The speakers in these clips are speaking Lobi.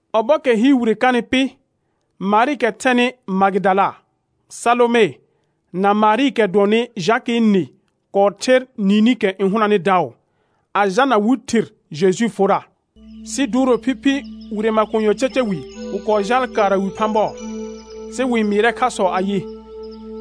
Ɔbɔɔkɛ hɩɩr wire kanɩ pɩ, Marɩɩkɛ thɛnɩ Magɩdala, Salome, na Marɩɩkɛ dʋɔnnɩ Jakɩɩ nɩ kɔɔ ther niinikɛ n hʋnanɩ daʋ, a jalna wɩ thir Jejuu forra. Sɩ duuro phiphi wire makonyɔɔ caca wi, wɩ kɔɔ jaal kaara wi phã bɔɔ. Sɩ wɩ-n mɩɩrɛ khasɔ ayɩ: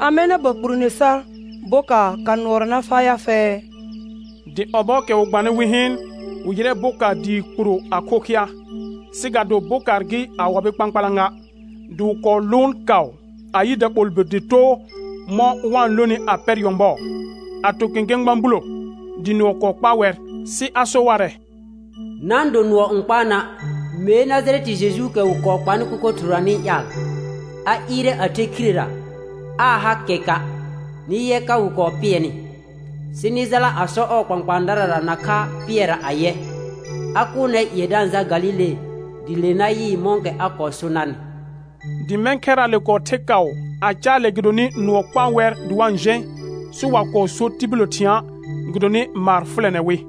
Amɛ na ba kpurone sar bokaar ka nʋɔra na faa ya fɛ? Dɩ ɔbɔɔkɛ wɩ gbanɩ wɩ hɩɩn, wɩ yɩrɛ bokaar dɩɩ kpuro a khokhɩa, sɩ ga do bokaar gɩ a wabɩ kpãkpalã ga. Dɩ wɩ kɔɔ lʋʋn kaʋ a yɩ daɓolbir dɩ too mɔ̃ wa-n lonɩ a pɛr nyɔ̃bɔɔ, a to kẽkẽ gbã bulo, dɩ nʋɔ kɔɔ kpaa wɛr. Sɩ a so warɛ: Na-n do nʋɔ n kpaa na'; mee Najarɛtɩ Jejuukɛ wɩ kɔɔ kpanɩ kʋkʋ thɩrʋra nɩ-n ƴaal. A ɩɩrɛ a the khirera, aa ha kɛka'; nɩ yɛ ka wɩ kɔɔ pɩɛnɩ. Sɩ nɩ jala a sɔ ɔɔ kpãkpãadarara nakha Pɩɛrra ayɛ: A kʋʋl nɛr ƴɩɛ da-n jal Galile, dɩ le na yɩɩ mɔ̃kɛ a kɔɔ so narnɩ. Dɩ mɛ̃ khɛraale kɔɔ the kaʋ a caalɛ gɩdonɩ nʋɔ kpaa wɛr dɩ wa-n jẽ, sɩ wa kɔɔ so tibillə thɩ̃a', gɩdonɩ maar fʋlɛnɛ wɩ.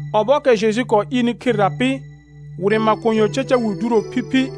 [Ɔbɔɔkɛ Jeju kɔɔ ɩɩrnɩ khirera pɩ, wire makonyɔɔ caca wi duuro phiphi,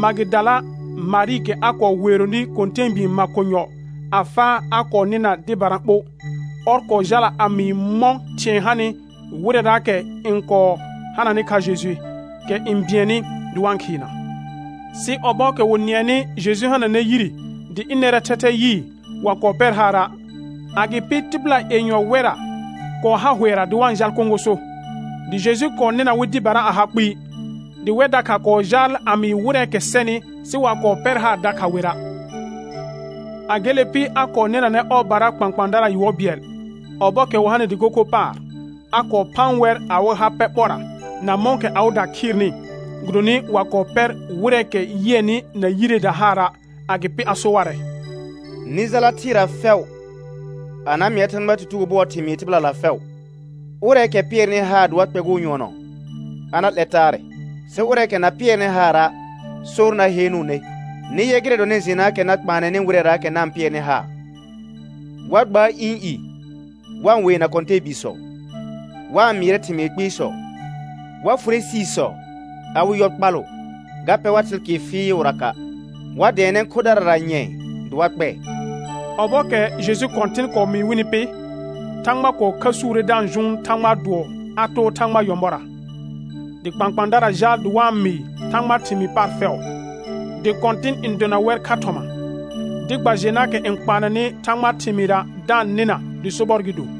Magɩdala Marɩɩkɛ a kɔɔ weeronɩ kɔ̃tɛɛbii makonyɔ a faa a kɔɔ nɩna dɩbara ɓo. Ɔr kɔɔ jala a mɩɩ mɔ̃ thɩ̃ɛ hanɩ wɩrɛraakɛ n kɔɔ hananɩ kha Jeju, kɛ n bɩɛnnɩ dɩ wa-n khɩɩna. Sɩ ɔbɔɔkɛ wɩ nɩɛnɩ Jeju hananɛ yire dɩ ɩnɛrɛɛ thɛthɛ yɩɩ, wa kɔɔ pɛr haara'. Agɩpɩ tɩbɩla yenyɔ wɛrra kɔɔ ha hʋɛra dɩ wa-n jal kõgoso, dɩ Jeju kɔɔ nɩna wɩ dɩbara a ha kpɩɩ. Dɩ wɛr dakha kɔɔ jaal a mɩɩ wɩrɛɛkɛ sɛnɩ, sɩ wa kɔɔ pɛr haar dakha wera'. A gele pɩ, a kɔɔ nɩnanɛ ɔɔbara kpãkpãadara yʋɔr bɩɛl, ɔbɔɔkɛ wɩ hanɩ dɩko kho paar, a kɔɔ phaan wɛr awɩ ha pɛ ɓɔrra na mɔ̃kɛ awɩda khɩɩrnɩ, gɩdonɩ wa kɔɔ pɛr wɩrɛɛkɛ yɩɛnɩ na yireeda haara'. Agɩpɩ a so warɛ: Nɩ jala thɩɩra fɛʋ a na mɩa Thãgbaa tutugo bʋɔɔ thɩmɩɩ tɩbɩlala fɛʋ. Ʋrɛɛkɛ pɩɛrnɩ haar dɩ wa kpɛgʋʋ nyʋɔnɔ a na 'lɛr taarɛ, sɩ ʋrɛɛkɛ na pɩɛrnɩ haara', sor na heenuune. Nɩ yɛ gɩrɛ dɔnɩ jenaakɛ na kpaanɛnɩ wɩrɛraakɛ na-n pɩɛrnɩ haar: Wa gbaar ɩ̃ i wa-n weena kɔ̃tɛɛbiisɔ, wa-n mɩɩrɛ thɩmɩɩ kpɩɩsɔ; wa fʋrɛ siisɔ; a wɩ yɔ kpalʋ, ga pɛ war thɩlkɩɩr fɩɩʋraka'; wa dɛɛnɛ khodarara nyɛ̃ɛ dɩ wa kpɛɛ. Ɔbɔɔkɛ Jeju Kɔ̃tɩn kɔɔ mɩɩ wɩnɩ pɩ, Thãgba kɔɔ khəsuure da-n jʋʋn Thãgbaa dʋɔ a too ɔɔ nyɔ̃bɔra. Dɩ kpãkpãadara jaal dɩ wa-n mɩɩ Thãgbaa thɩmɩɩ paar fɛʋ, dɩ Kɔ̃tɩn n dona wɛr kha thɔma, dɩ gba jenaakɛ n kpaanɛnɩ Thãgbaa thɩmɩɩra da-n nɩna dɩ sobɔr gɩ do.]